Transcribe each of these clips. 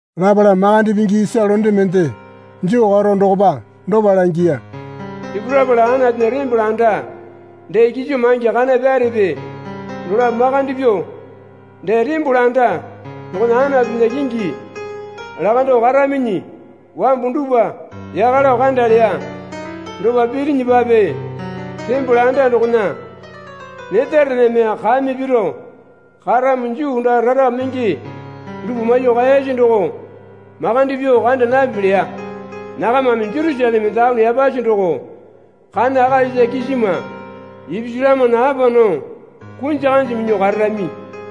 Lapala makande pingi isa londe mende joo karo dokopa dopa langiya. Sipurapala Anatunya tembole anda dee kiso maingi kana pyarepe dolapo makande pyuo, dee tembole anda dokona Anatunya kingi lakando karaminyi wambu dupwa yaka lao kanda leya. Dopa pirinyipape tembole anda dokona netarename kame piro karamo Juu daa rara menge dupwa maiyuo kaeyasi doko makande pyuo kanda napipi leya. Nakamame Jerusaleme Taone Yapasi doko kana akalisa kisima ipisu lamana apa nao kunji kanji minyuo kararami.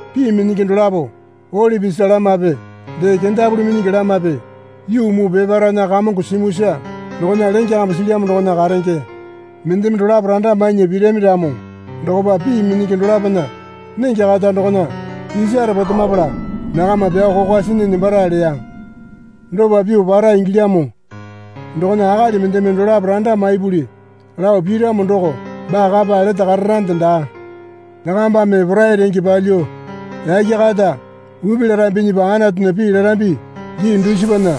Pii minyingi dolapo olipi isa lamape dee kendapuli minyingi lamape yuu muu peparaena Kamongo simuisa dokona lenge kambu silyamo dokona karenge. Mendeme dolapo randa mainya pirami ramo dokopa pii minyingi dolapona nenge kata dokona isare potemapala nakama pyao kokwa sinyi nembara leya. Dopa pyuo para ingilyamo dokona akali mendeme dolapo randa maipuli lao piramo doko baa kapa lete kararande daa. Nakambame porai renge palyuo yake kata upi larambinyipa Anatunya pii larambi gii dusipana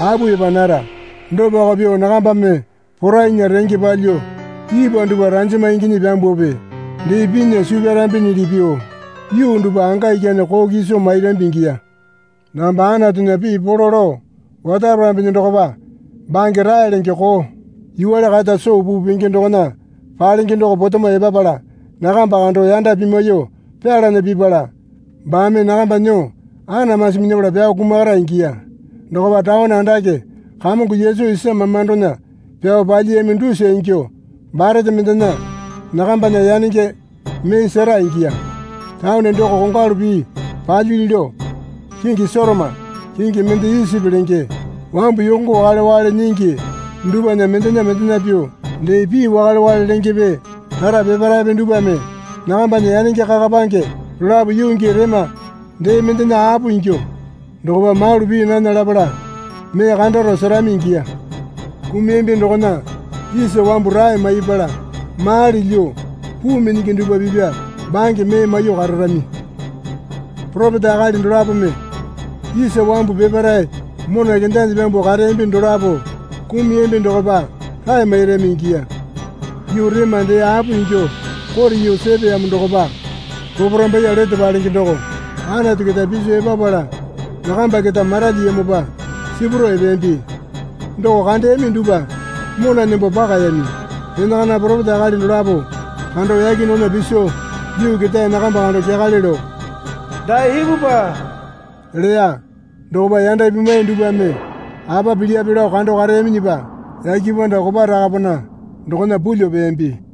apu epa nara. Dopako pyuo nakambame porainya renge palyuo ipwa dupwa ranjama inginyi pyambuope dee pinya suu pyarambinyili pyuo yuu dupwa anga ikyane koo kiso mairambi ingiya. Nakamba Anatunya pii polo lao otaparambinyi dokopa bange rae lenge koo yuwale kata soo puu penge dokona palenge doko potemo epapala nakamba kando yanda pimwaiyuo pyalana pipala baame nakamba nyuo anamasi minyapala pyao kumakara ingiya. Dokopa taone andake Kamongo Yesu isa mamandona pyao palyiyami dusa ingyuo barete mendena nakambana yanenge mee sera ingiya. Taone doko kongwalu pii palyili lao kingi Sotoma kingi mende Isipi lenge. Wambu yongo wakale wakale nyingi dupwana mendena mendena pyuo, dee pii wakale wakale lengepe rara peparaepe dupwame nakambana yanenge kakapange dolapo yuu gii rema dee mendena apo ingyuo dokopa malu pii nana lapala mee kandaro serami ingiya. Kumuyambi dokona isa wambu rae maipala mali lyuo puu minyingi dupwa pipya bange mee maiyuo kararami. Poropeta akali dolapome isa wambu peparae mona kendanyi pyambuo kareyambi dolapo kumuyambi dokopa rae mairami ingiya. Yuu rema dee apo ingyuo kote yuu sepeyamo dokopa poporambaiye lete palenge doko Anatu keta piso epapala nakamba keta maralyiyamopa sipurao epeyambi. Doko kandeyami dupwa mona nembo pakayami. Enakana poropeta akali dolapo kando yake dokona piso yuu ketae nakamba kando kyakale lao, Dae ipupwa leya. Dokopa yanda pimwai dupwame apa pilyape lao kando kareyaminyipa yake panda kopa rakapana dokona pulyuo peyambi.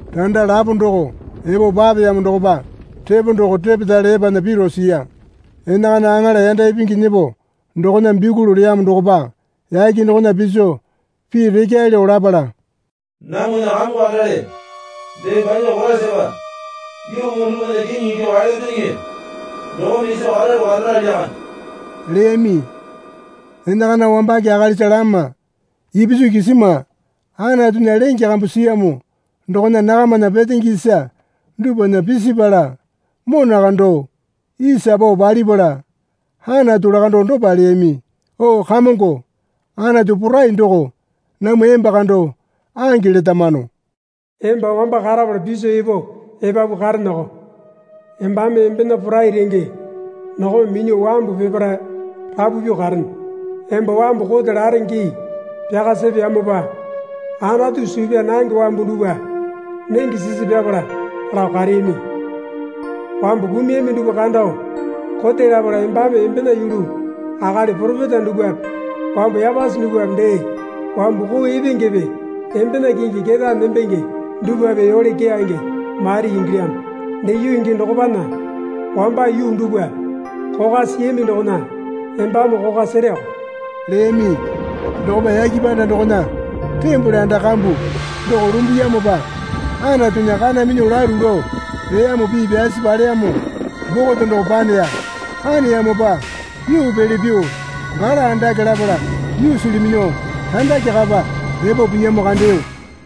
Randa lapo doko epo papeyamo dokopa repo doko repetale epana piro siya. Enakana aŋala yanda ipingi nyepo dokona bikuli leyamo dokopa yake dokona piso pii rekyae lao lapala, Namwana Kamongo kandale dee banya Koraisapa yuu muu dupwana kiŋi ingyuo kaelyambinyiŋi. Dokome iso karalu karara lyakande leyami. Enakana wambake akalisa lama ipisu kisima Anatunya lenge kambu siyamo dokona nakamana petenge isa dupwana pisipala mona kando isa pao palipala Anatu lakandao dopa leyami. O Kamongo Anatu Porai doko namwa emba kando ange letamano. Emba wamba karapala piso epo epapu kareneoko. Embame embena porai renge dokome minyuo wambu peparae rapu pyuo karene. Emba wambu kote lare gii pyaka sepeyamopa Anatu suu pyaa nange wambu dupwa nenge sisi pyapala lao kareyami. Wambu kumuyami dupwa kando kote lapala embame embena yulu akali poropeta dupwape wambu yapasi dupwape dee wambu koo epengepe embena kingi ketae nembenge dupwape yole keyange mairi ingilyamo. Dee yuu gii dokopana wamba yuu dupwa kokwa siyami dokona embame kokwa sereoko leyami. Dokopa yake panda dokona tembole anda kambu doko lumbuyamopa Anatunya Kana Minyuo Lalu Lao Leyamo Pii Pyasi Paleyamo Bokote doko paneya. Paneyamopa yuu pele pyuo gala andake lapala yuusili minyuo randake kapa epo piyamo kandeyo.